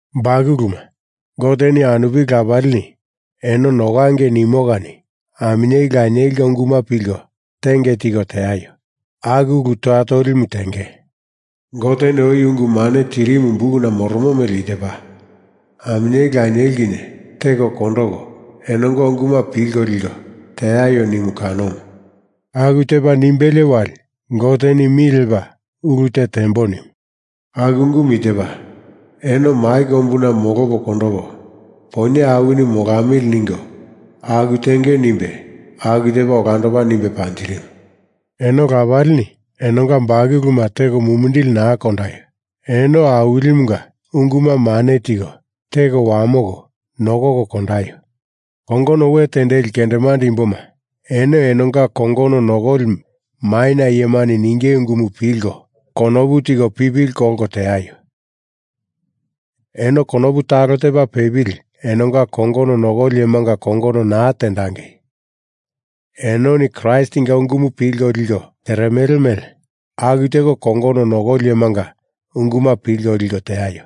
Bakuluma, Goteni anupili lapalini eno nokangei nimo kani aminyeli lanielinga unguma pilko tenge tiko teaio. Aku ulu toya tolimu tenge. Goteni oi ungu mane tirimu bukuna moromo mele i tepa, aminyeli lanieli kinye teko kondoko enonga unguma pilko liko teaio nimu kanomu. Aku tepa nimbelie wali Goteni mi lepa ulu te tembo nimu. Aku ungumu i tepa, eno mai kombuna molopo kondopo, poinye awini molamili ningo aku tenge nimbe aku tepa olandopa nimbe panjirimu. Eno lapalini, enonga bakuluma teko mumindili naa kondaio. Eno Awilimunga unguma mane tiko teko wamoko nokoko kondaio. Kongono we tendeli kendemande imboma, eno enonga kongono nokoli maina iyemani ninge ungumu pilko konopu tiko pipili kolko teaio. Eno konopu talo tepa pepili enonga kongono nokoli iyemanga kongono naa tendangei. Enoni Kraistinga ungumu pilko liko teremele mele aku teko kongono nokoli iyemanga unguma pilko liko teaio.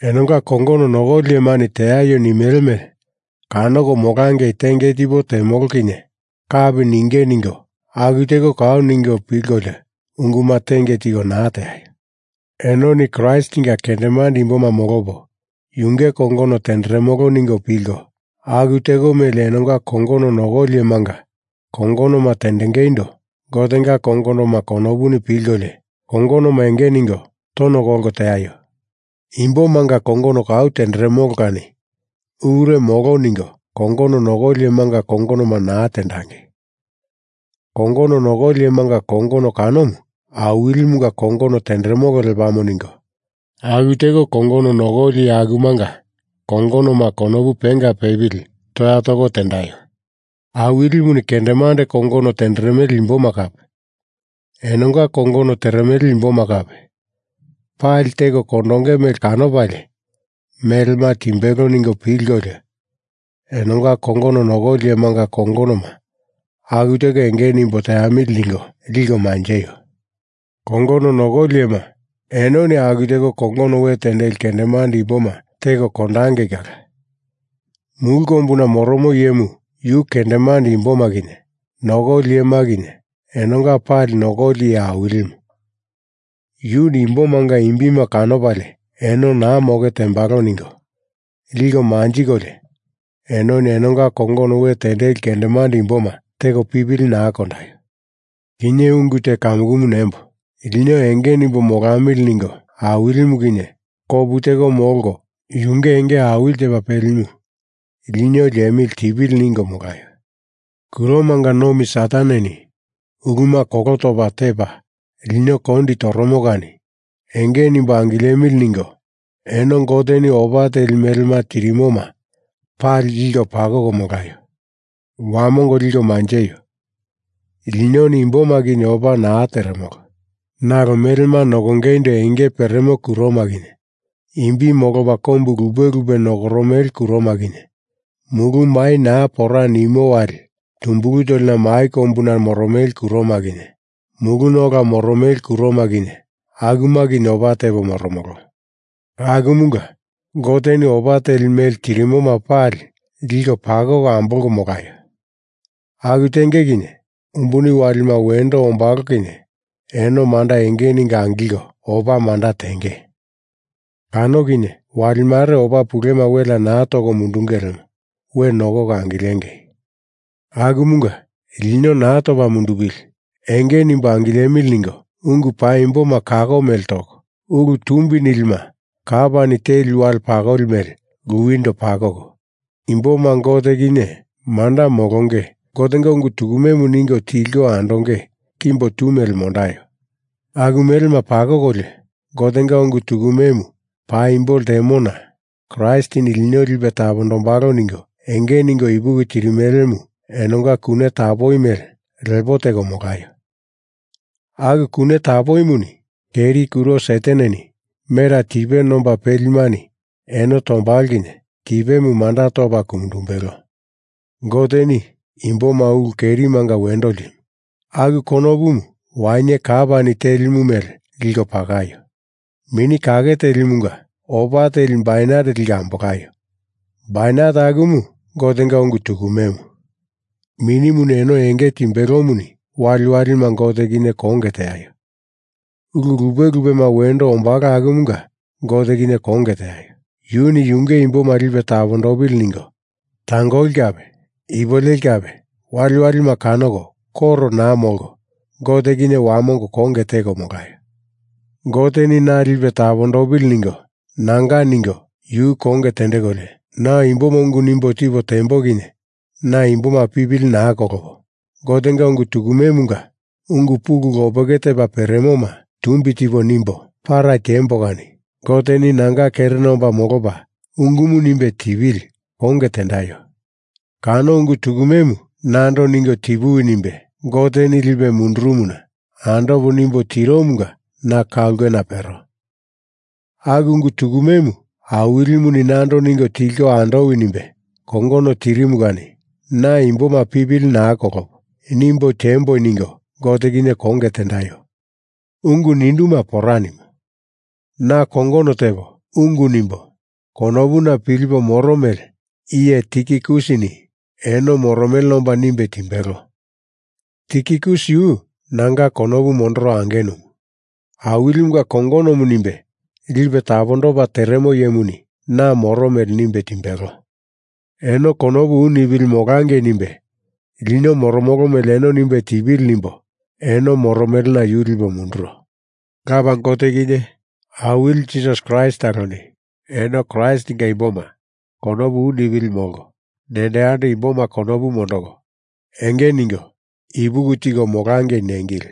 Enonga kongono nokoli iyemani teaio nimele mele kanoko molangei tenge tipo temolo kinye kapi ninge ningo aku teko kau ningo pilkolio unguma tenge tiko naa teaio. Enoni Kraistinga kendemande imboma molopo yunge kongono tenderemolo ningo pilko aku teko mele enonga kongono nokoli iyemanga kongonoma tendengeindo Gotenga kongonoma konopuni pilkolio kongonoma enge ningo tono kolko teaio. Imbomanga kongono kau tenderemolo kani ulure molo ningo kongono nokoli iyemanga kongonoma naa tendangei. Kongono nokoli iyemanga kongono kanomu Awilimunga kongono tenderemolo lepamo ningo aku teko kongono nokoli iye akumanga kongonoma konopu penga pepili toya toko tendaio. Awilimuni kendemande kongono tenderemele imboma kape enonga kongono teremele imboma kape pali teko kondonge mele kanopalie melema timbelo ningo pilkolio enonga kongono nokoli iyemanga kongonoma aku teko enge nimbo teamili ningo liko manjeio. Kongono nokoli iyema, enoni aku teko kongono we tendeli kendemande imboma teko kondangei kala. Mulu kombuna moromo iyemu yu kendemande imboma kinye nokoli iyema kinye enonga pali Nokoli Iye Awilimu. Yuni imbomanga imbima kanopalie eno naa moke tembalo ningo liko manjikolio enoni enonga kongono we tendeli kendemande imboma teko pipili naa kondaio. Kinye ungu te kamukumu nembo, lino enge nimbo molamili ningo Awilimu kinye kopu teko molko yunge enge awili tepa pelimu lino liemili tipili ningo molaio. Kuromanga nomi Sataneni uluma kolo topa tepa lino kondi toromo kani enge nimbo angilemili ningo eno Goteni opa teli melema tirimoma pali liko pakoko molaio. Wamongo liko manjeio. Linoni imboma kinye opa naa teremolo. Nalo melema nokongeindo enge peremo kuroma kinye, imbi molopa kombu lupe lupe nokoromele kuroma kinye, mulu mai naa pora nimo wali tumbulu tolina mai kombuna nokoromele kuroma kinye, muluna ola moromele kuroma kinye, akuma kinye opa tepo moromolo. Akumunga Goteni opa teli mele tirimoma pali liko pakoko ambolko molaio. Aku tenge kinye umbuni walima wendo ombalo kinye eno manda enge ningo angilko opa manda tenge. Kano kinye wali mare opa pulema welea naa toko mundunge lemo we nokoko angilengei. Akumunga lino naa topa mundupili, enge nimbo angilemili ningo ungu paimboma kako mele toko, ulu tumbi nilima kapani teli wale pakoli mele luwindo pakoko imboma Gote kinye manda molonge Gotenga ungu tukumemu ningo tilko andonge kimbo tu mele mondaio. Aku melema pakokolio, Gotenga ungu tukume paimbo ltemona Kraistini lino lipe tapondombalo ningo enge ningo ipuki tirimelemu enonga kune tapoi mele lepo teko molaio. Aku kune tapoimuni keri kuro Sataneni mera tipe nomba pelimani eno tombalo kinye tipemu manda topa ku mundumbelo. Goteni imboma ulu kerimanga wendo ltimu. Aku konopumu wainye kapani telimu mele liko pakaio. Mini Kake Telimunga opa teli bainet liko ambolaio. Bainet akumu Gotenga ungu tukumemu. Minimuni eno enge timbelomuni waliwalima Gote kinye konge teaio. Ulu lupe lupema wendo ombalo akumanga Gote kinye konge teaio. Yuni yunge imboma lipe tapondopili ningo tangoli kape ipuleli kape waliwalima kanoko koro naa molko Gote kinye wamongo konge teko molaio. Goteni na lipe tapondopili ningo nanga ningo yu konge tendekolio, na imboma ungu nimbo tipo tembo kinye na imboma pipili naa kolopo Gotenga ungu tukumemunga ungu pulu lopeke tepa peremoma tumbi tipo nimbo para tiembo kani Goteni nanga kerena omba molopa ungumu nimbe tipili konge tendaio. Kano ungu tukumemu nando ningo tipuwi nimbe Goteni lipe mundurumuna andopo nimbo tiromunga na ka ulkena pero. Aku ungu tukumemu Awilimuni nando ningo tilko andowi nimbe kongono tirimu kani na imboma pipili naa kolopo nimbo tiembo ningo Gote kinye konge tendaio. Ungu ninduma pora nimo. Na kongono tepo, ungu nimbo, konopuna pilipo moro mele iye Tikikusini eno moromelena omba nimbe timbelo. Tikikus yu nanga konopu mondoro angenumu, Awilimunga kongonomu nimbe lipe tapondopa teremo iyemuni na moro mele nimbe timbelo. Eno konopu u nipili molangei nimbe lino moromolo mele eno nimbe tipili nimbo eno moromelena yu lipo munduro. Lapa Gote kinye Awili Jisasi Kraist taloni eno Kraistinga imboma konopu u nipili molko, nendo yando imboma konopu mondoko, enge ningo ipuki tiko molangei nengili.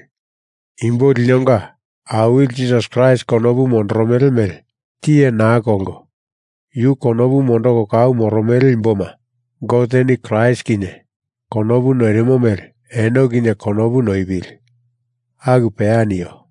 Imbo linonga Awili Jisasi Kraist konopu mondoromele mele tiye naa kolko yu konopu mondoko kau moromele imboma Goteni Kraist kinye konopu noirimo mele eno kinye konopu noipili. Aku peya nio.